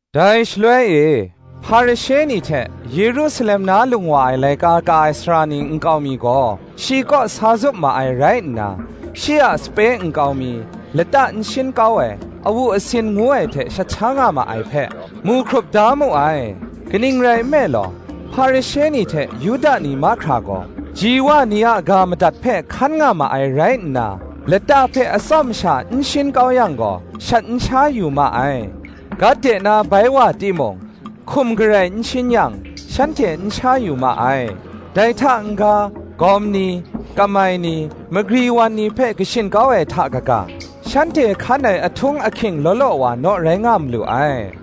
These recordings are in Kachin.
Dai shaloi e, Hparishe ni hte, Yerusalem na lung wa ai laika ka ai sara ni nkau mi gaw, shi kaw sa zup ma ai rai nna, shi a sape nkau mi, lata n shin kau ai, awu asin ngu ai hte shat sha nga ma ai hpe, mu hkrup da mu ai. Kaning rai nme law, Hparishe ni hte Yuda ni mahkra gaw, ji wa ni a ga madat hpe hkan nga ma ai rai nna, lata hpe atsawm sha n shin kau yang gaw, shat n sha yu ma ai: gat de na bai wa timung, hkum garai n shin yang, shanhte n sha yu ma ai: dai hta n-ga; gawm ni, kamai ni, magri wan ni hpe kashin kau ai hta kaga, shanhte hkan ai ahtung ahking law law wa, naw rai nga malu ai.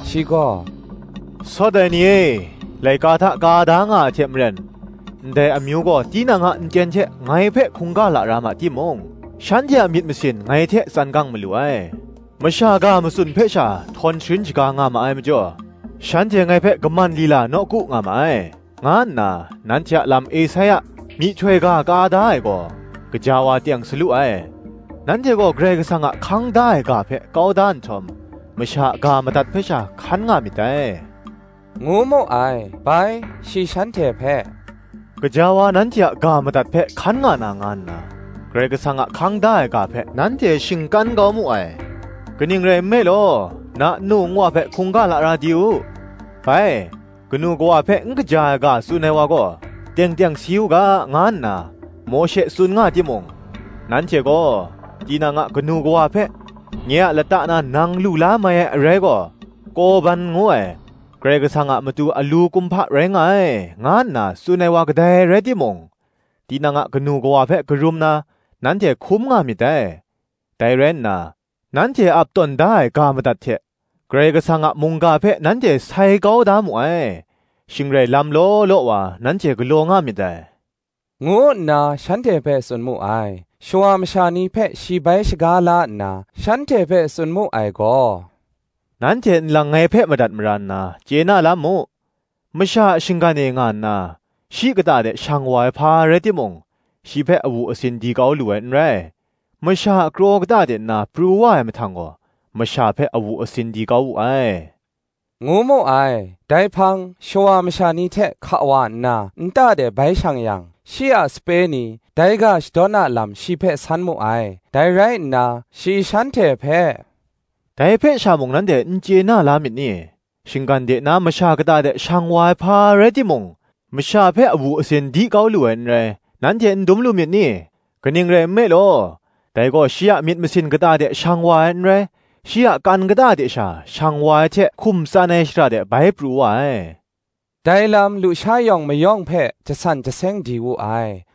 Shi gaw, “Sawt ai ni e, laika hta ka da nga ai hte maren, Ndai amyu gaw tinang a nten hte ngai hpe hkungga lara ma timung, Shanhte a myit masin ngai hte tsan gang malu ai: Masha ga matsun hpe sha, htawn sharin shaga nga ma ai majaw, Shanhte ngai hpe kaman lila nawku nga ma ai, nga nna, nanhte a lam Esaia, myihtoi ga ka da ai gaw, gaja wa teng sa lu ai. Nanhte gaw Karai Kasang a hkang da ai ga hpe kau da nhtawm, masha a ga madat hpe sha hkan nga myit dai,” ngu mu ai. Bai, shi shanhte hpe, “Gaja wa nanhte a ga madat hpe hkan nga na nga nna. Karai Kasang a hkang da ai ga hpe nanhte shingkan kau mu ai. Kaning rai nme law, “Na nnu nwa hpe hkungga lara di u; bai, Kanu kawa hpe n kaja ai ga tsun ai wa gaw, teng teng si u ga, nga nna Mawshe tsun nga timung, nanhte gaw, tinang a kanu kawa hpe, ‘Nye a lata na nang lu la mai ai arai gaw, Korban ngu ai, Karai Kasang a matu alu kumhpa rai nga ai,’ nga nna tsun ai wa kadai rai timung, tinang a kanu kawa hpe karum na, nanhte hkum nga myit dai; dai rai nna, nanhte ap tawn da ai ga madat hte, Karai Kasang a mungga hpe nanhte sai kau da mu ai; shing rai lam law law wa nanhte galaw nga myit dai,” ngu nna shanhte hpe tsun mu ai. Shawa masha ni hpe shi bai shaga la nna shanhte hpe tsun mu ai gaw, “Nanhte nlang ngai hpe madat mara nna, chye na la mu: masha a shinggan e nga nna, shi kata de shang wa ai hpa rai timung, shi hpe awu asin di kau lu ai n rai; masha a kraw kata de nna pru wa ai mahtang gaw, masha hpe awu asin di kau wu ai,” ngu mu ai. Dai hpang, shawa masha ni hte hka wa nna, nta de bai shang yang, shi a sape ni, dai ga shadawn a lam shi hpe san mu ai. Dai rai nna, shi shanhte hpe, “Dai hpe sha mung nanhte n chye na la myit ni? Shinggan de nna masha kata de shang wa ai hpa rai timung, masha hpe awu asin di kau lu ai n rai, nanhte n dum lu myit ni? kaning rai nme law, dai gaw, shi a myit masin kata de shang wa ai n rai, shi a kan kata de sha shang wa ai hte hkum tsan ai shara de bai pru wa ai: dai lam lusha yawng mayawng hpe jasan jaseng di wu ai.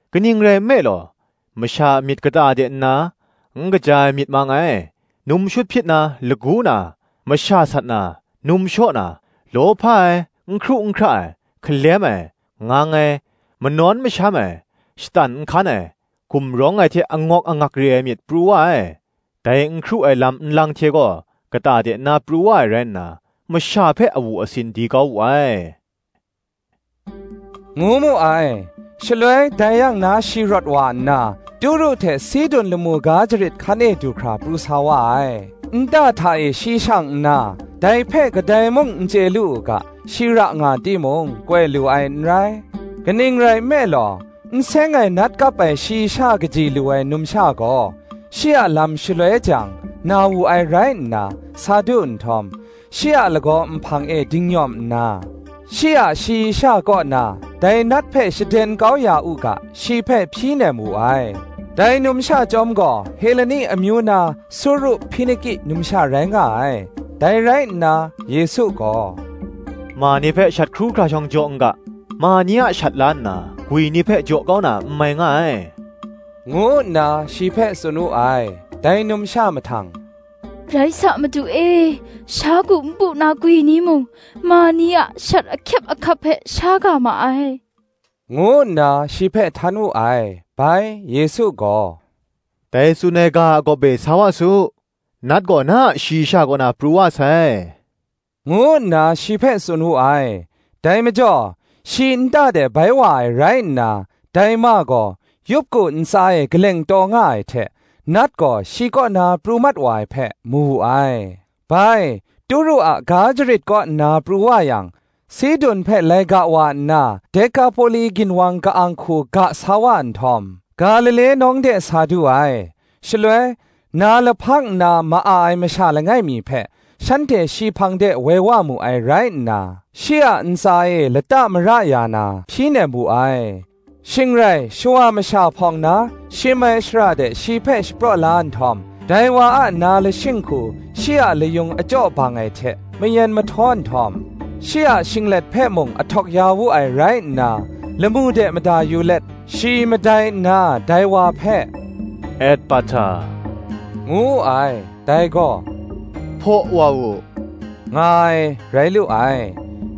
kaning rai nme law, masha a myit kata de nna, n kaja ai myit mang ai, num shut hpyit na, lagu na, masha sat na, num shaw na, lawhpa ai, n hkru n hkra ai, hkalem ai, ngang ai, manawn masham ai, shatan nhkan ai, gumrawng ai hte angawk angak re ai myit, pru wa ai: dai n hkru ai lam nlang hte gaw kata de nna pru wa ai rai nna, masha hpe awu asin di kau wu ai,” ngu mu ai. Shaloi dai yang na shi rawt wa nna, Turu hte Sidun lamu ga jarit hkan e du hkra pru sa wa ai. Nta hta e shi shang nna, dai hpe kadai mung n chye lu u ga, shi ra nga timung, koi lu ai n rai. Kaning rai nme law, n seng ai nat kap ai shayi sha kaji lu ai numsha gaw, shi a lam shaloi jang, na wu ai rai nna, sa du nhtawm, shi a lagaw nhpang e dingnyawm nna, shi a shayi sha kaw na dai nat hpe shaden kau ya u ga, shi hpe hpyi nem wu ai: dai numsha chyawm gaw Heleni amyu na Suru-Hpiniki numsha rai nga ai. Dai rai nna Yesu gaw, “Ma ni hpe shat hkru hkra shawng jaw n ga: ma ni a shat la nna, gwi ni hpe jaw kau na n mai nga ai,” ngu nna shi hpe tsun wu ai. Dai numsha mahtang, “Rai sa, Madu e, sha ku npu na gwi ni mung, ma ni a shat ahkyep ahkap hpe sha ga ma ai,” ngu nna shi hpe htan wu ai. Bai, Yesu gaw, “Dai tsun ai ga a gawp e sa wa su: nat gaw, na a shayi sha kaw na pru wa sai,” ngu nna shi hpe tsun wu ai. Dai majaw shi nta de bai wa ai rai nna, dai ma gaw yup ku ntsa e kaleng taw nga ai hte, nat gaw shi kaw na pru mat ai hpe, mu wu ai. Bai, Turu a ga jarit kaw nna pru wa yang, Sidun hpe lai ga wa nna, Dekapoli ginwang ka-ang hku ga sa wa nhtawm, Galile nawng de sa du ai. Shaloi na lahpang nna ma-a ai masha langai mi hpe, shanhte shi hpang de woi wa mu ai rai nna, shi a ntsa e lata mara ya na, hpyi nem wu ai. Shing rai shawa masha hpawng na, shim ai shara de shi hpe shapraw la nhtawm, dai wa a na lashing hku shi a layung achyaw bang ai hte, mayen mahtaw nhtawm, shi a shinglet hpe mung ahtawk ya wu ai rai nna, lamu de mada yu let, shi madai nna, dai wa hpe, “Ethpahta,” ngu wu ai: dai gaw, “Hpaw wa u,” nga ai, rai lu ai.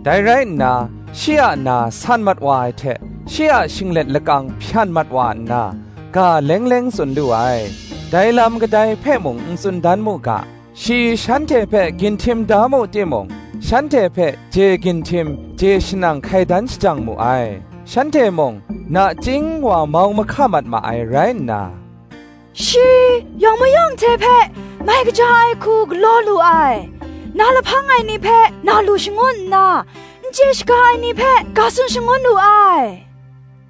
Dai rai nna, shi a na san mat wa ai hte, shi a shinglet lakang hpyan mat wa nna, ga leng leng tsun lu ai. Dai lam kadai hpe mung n tsun dan mu ga, shi shanhte hpe ginhtim da mu timung, shanhte hpe je ginhtim je shanang hkai dan shajang mu ai. Shanhte mung nachying wa mau mahka mat ma ai rai nna, “Shi yawng mayawng hte hpe mai kaja ai hku galaw lu ai: na lahpang ai ni hpe na lu shangun nna, n chye shaga ai ni hpe ga tsun shangun lu ai,”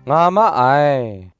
nga ma ai.